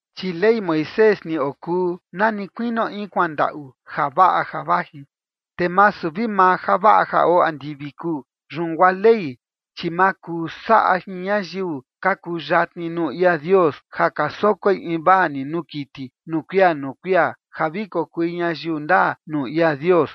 Chi Ley Moisés ni okuu na ni kuinio in kuandaꞌu javaꞌa ja vaji, te masu vi maa javaꞌa ja oo andivi kuu. Yun guaa Ley, chi ma kuu saꞌa jin ñayiu ka kuyatni nuu ia Dios ja ka sokoi invaa ni nuu kiti nuu kuia nuu kuia ja vi kokui ñayiu ndaa nuu ia Dios.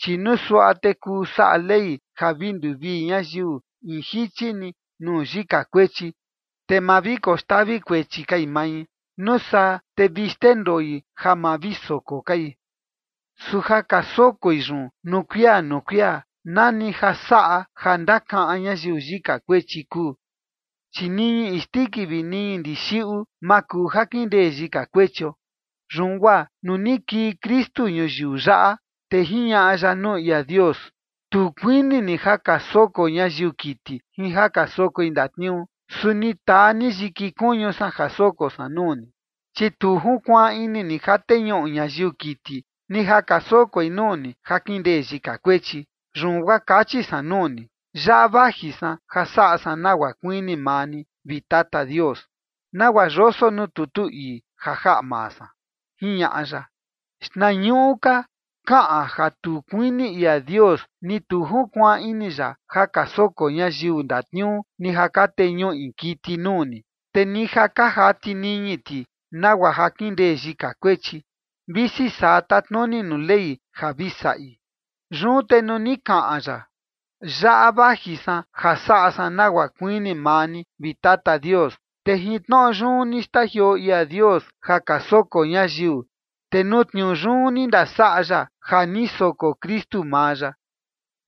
Chi nuu suaꞌa te kuu saꞌa Ley ja vi nduvii ñayiu in jichi ni nuu yika kuechi, te ma vi koxtavi kuechi kai mai, nuu saa te vi xndendoi ja ma vi soko kai. Su ja ka sokoi yun nuu kuia nuu kuia, nani ja saꞌa ja ka ndakaꞌan ñayiu yika kuechi kuu. Chi niñi isndiki vi niñi ndixiꞌu, ma kuu ja kindee yika kuechio. Yun guaa nuu ni kii Kristu ñuyiu yaꞌa, te jiñaꞌa ya nuu ia Dios: Tu kuini ni ja ka soko ñayiu kiti jin ja ka sokoi ndatniuu, su ni taa ni yiki kuñu san ja soko san nuu ni. Chi tu junkuaan ini ni ja teñuꞌu ñayiu kiti, ni ja ka sokoi nuu ni ja kindee yika kuechi. Yun guaa kachi san nuu ni: “Yaꞌa vaji san ja saꞌa san nagua kuini maa ni, vi Tata Dios, nagua yoso nuu tutu ii ja jaꞌa maa san”, jiñaꞌa ya. Xtnañuꞌu ka kaꞌan ja tu kuini ia Dios ni tu junkuaan ini ya ja ka soko ñayiu ndatniuu ni ja ka teñuꞌi kiti nuu ni, te ni ja ka jati niñi ti nagua ja kindee yika kuechi, visi saa tatnuni nuu Ley ja vi saꞌi. Yun te nuu ni kaꞌan ya: “Yaꞌa vaji san ja saꞌa san nagua kuini maa ni, vi Tata Dios”, te jin tnoꞌo yun ni xtajioo ia Dios ja ka soko ñayiu, te nuu tniuu yun ni ndasaꞌa ya ja ni soko Kristu maa ya.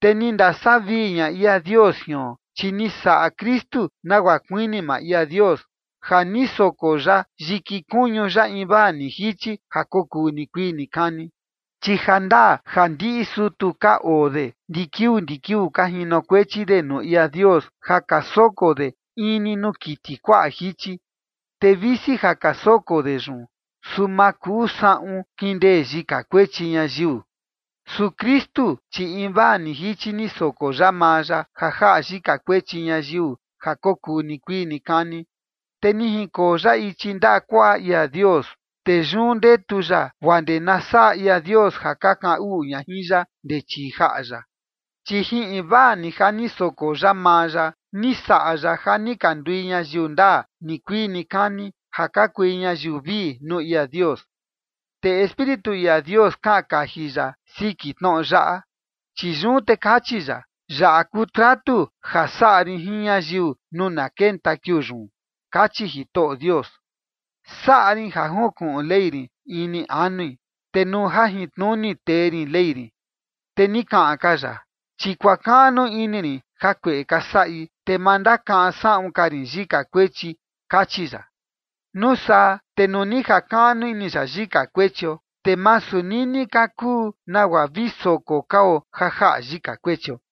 Te ni ndasavii ña ia Dios jion, chi ni saꞌa Kristu nagua kuini maa ia Dios, ja ni soko ya yiki kuñu ya invaa ni jichi ja kokuu nikuii nikani. Chi jandaa ja ndiꞌi sutu ka oo de ndi kiuu ndi kiuu ka jinokuechi de nuu ia Dios ja ka soko de in ni nuu kiti kuaꞌa jichi. Te visi ja ka soko de yun, su ma kuu saꞌun kindee yika kuechi ñayiu. Su Kristu, chi invaa ni jichi ni soko ya maa ya ja jaꞌa yika kuechi ñayiu ja kokuu nikuii nikani, te ni junkoo ya ichi ndaꞌa kuaꞌa ia Dios. Te yun ndetu ya guaa ndee na saꞌa ia Dios ja ka kaꞌan uꞌu ña jin ya ndee chii jaꞌa ya. Chi jin invaa ni ja ni soko ya maa ya ni saꞌa ya ja ni ka ndui ñayiu ndaa nikuii nikani, ja ka kui ñayiu vii nuu ia Dios. Te Espíritu ia Dios kaꞌan kaji ya siki tnoꞌo yaꞌa, chi yun te kachi ya: Yaꞌa kuu tratu ja saꞌa rin jin ñayiu nuu na kenta kiuu yun, kachi Jitoꞌo Dios: Saꞌa rin ja junkuꞌun Ley rin ini anui, te nuu jajintnuni tee rin Ley rin. Te ni kaꞌan ka ya: Chi kuakaꞌnu ini rin jakueꞌe ka saꞌi, te ma ndakaꞌan saꞌun ka rin yika kuechi, kachi ya. Nuu saa te nuu ni jakaꞌnu ini ya yika kuechio, te masu nini ka kuu nagua vi soko kao ja jaꞌa yika kuechio.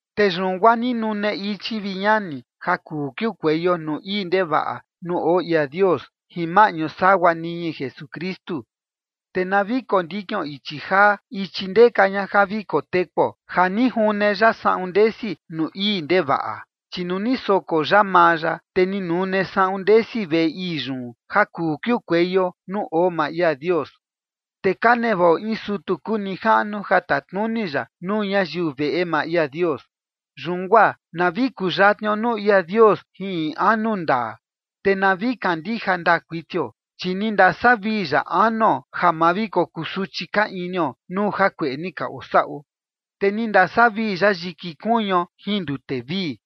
Te yun guaa ni nune ichi, vi ñani, ja kuu kiukueio nuu ii ndevaꞌa nuu oo ia Dios jin maꞌñu sagua niñi Jesukristu. Te na vi kondikion ichi jaa, ichi ndeka ña ja vi kotekuo ja ni june ya saꞌun ndesi nuu ii ndevaꞌa. Chi nuu ni soko ya maa ya, te ni nune saꞌun ndesi veꞌe ii yun ja kuu kiukueio nuu oo maa ia Dios. Te ka nevaꞌo in sutu kuu nijaꞌnu ja tatnuni ya nuu ñayiu veꞌe maa ia Dios. Yun guaa na vi kuyatnio nuu ia Dios jin in anu ndaa, te na vi kandija ndaa kuitio. Chi ni ndasavii ya anuo ja ma vi kokusuchi ka inio nuu jakueꞌe ni ka osaꞌo, te ni ndasavii ya yiki kuñuo jin ndute vii.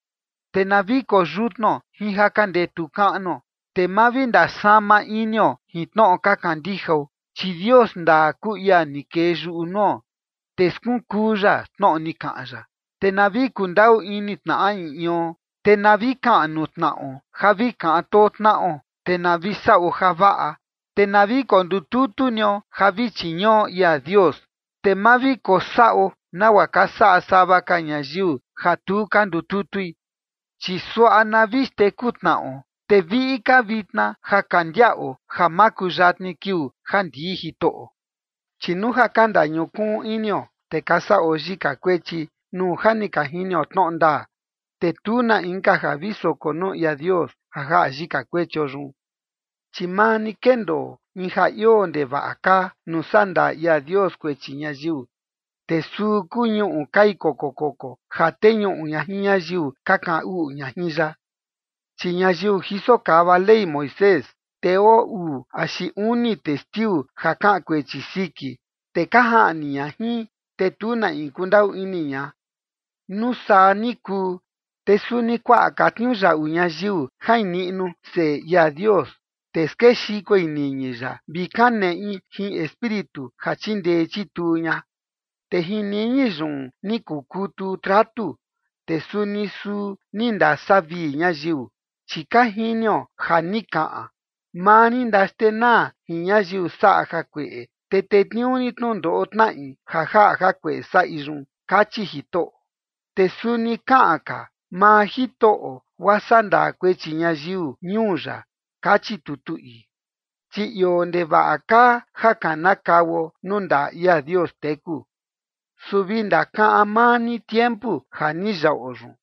Te na vi koyutnuo jin ja ka ndetu kaꞌnuo, te ma vi ndasama inio jin tnoꞌo ka kandijao, chi Dios ndaa kuu ia ni kee yuꞌu nuo, te skunkuu ya tnoꞌo ni kaꞌan ya. Te na vi kundaꞌu ini tnaꞌa in ion, te na vi kaꞌan nuu tnaꞌo ja vi kaꞌan too tnaꞌo, te na vi saꞌo javaꞌa. Te na vi kondututu nio ja vi chiñuꞌo ia Dios, te ma vi kosaꞌo nagua ka saꞌa sava ka ñayiu ja tu ka ndututui. Chi suaꞌa na vi xteku tnaꞌo, te viꞌi ka vitna ja ka ndiaꞌo ja makuyatni kiuu ja ndii Jitoꞌo. Chi nuu ja ka ndañukuun inio, te ka saꞌo yika kuechi, nuu ja ni ka jinio tnoꞌo ndaa, te tu na inka ja vi soko nuu ia Dios ja jaꞌa yika kuechio yun. Chi maa ni kendoo in ja ioo ndevaꞌa kaa nuu sandaa ia Dios kuechi ñayiu, te suu kuu ñuꞌu kai koko koko ja teñuꞌu ña jin ñayiu ka kaꞌan uꞌu ña jin ya. Chi ñayiu jiso kava Ley Moisés, te oo uu axi uni testiu ja kaꞌan kuechi siki, te ka jaꞌni ña jin, te tu na in kundaꞌu ini ña. Nuu saa ni kuu, te suni kuaꞌa ka tniuyaꞌu ñayiu jain niꞌnu Seꞌe ia Dios, te skexikoi niñi ya, vi kaneꞌi jin Espíritu ja chindee chituu ña. Te jin niñi yun ni kukutu tratu, te suni suu ni ndasavii ñayiu. Chi ka jinio ja ni kaꞌan: “Maa rin ndaxtenaa jin ñayiu saꞌa jakueꞌe, te tetniuu rin tnundoꞌo tnaꞌi ja jaꞌa jakueꞌe saꞌi yun”, kachi Jitoꞌo. Te suni kaꞌan ka: “Maa Jitoꞌo guaa sandaa kuechi ñayiu ñuu ya”, kachi tutu ii. Chi ioo ndevaꞌa kaa ja kanakauo nuu ndaꞌa ia Dios teku. Su vi ndakaꞌan maa ni tiempu ja ni yaꞌo yun,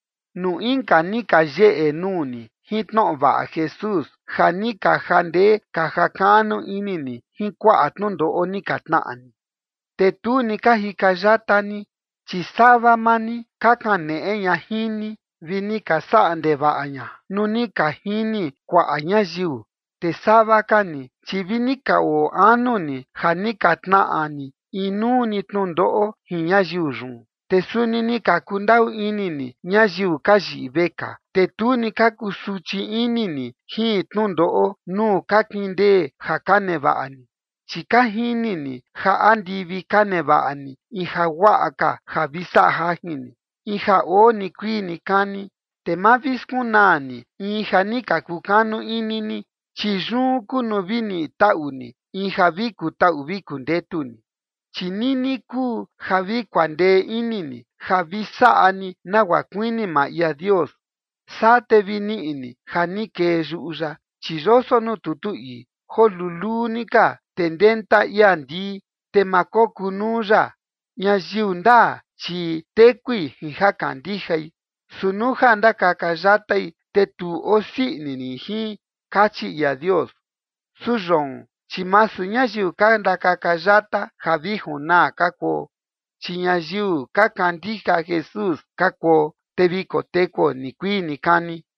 nuu inka ni ka yeꞌe nuu ni jin tnoꞌo vaꞌa Jesús ja ni ka jandee ka jakaꞌnu ini ni jin kuaꞌa tnundoꞌo ni ka tnaꞌa ni, te tu ni ka jika yata ni. Chi sava maa ni ka kaneꞌe ña jin ni vi ni ka saꞌa ndevaꞌa ña nuu ni ka jini kuaꞌa ñayiu. Te sava ka ni, chi vini ka oo anu ni ja ni ka tnaꞌa ni inuu ni tnundoꞌo jin ñayiu yun. Te suni ni ka kundaꞌu ini ni ñayiu ka yiꞌi vekaa, te tu ni ka kusuchi ini ni jin tnundoꞌo nuu ka kindee ja ka nevaꞌa ni, chi ka jini ni ja andivi ka nevaꞌa ni in jaguaꞌa ka ja vi saꞌa jajin ni, in ja oo nikuii nikani. Te ma vi skunaa ni in ja ni ka kukanu ini ni, chi yun kuu nuu vi niꞌi taꞌu ni in ja vi kutaꞌu vi kundetu ni. Chi nini kuu ja vi kuandee ini ni, ja vi saꞌa ni nagua kuini maa ia Dios, saa te vi niꞌi ni ja ni kee yuꞌu ya. Chi yoso nuu tutu ii: Joo luluu ni ka, te ndenta ia ndii, te ma kokunuu ya. Ñayiu ndaa, chi tekui jin ja kandijai. Su nuu ja ndakaka yatai, te tu osii ini rin jin, kachi ia Dios. Su yoon, chi masu ñayiu ka ndakaka yata ja vi junaa ka kuo, chi ñayiu ka kandija Jesús ka kuo, te vi kotekuo nikuii nikani.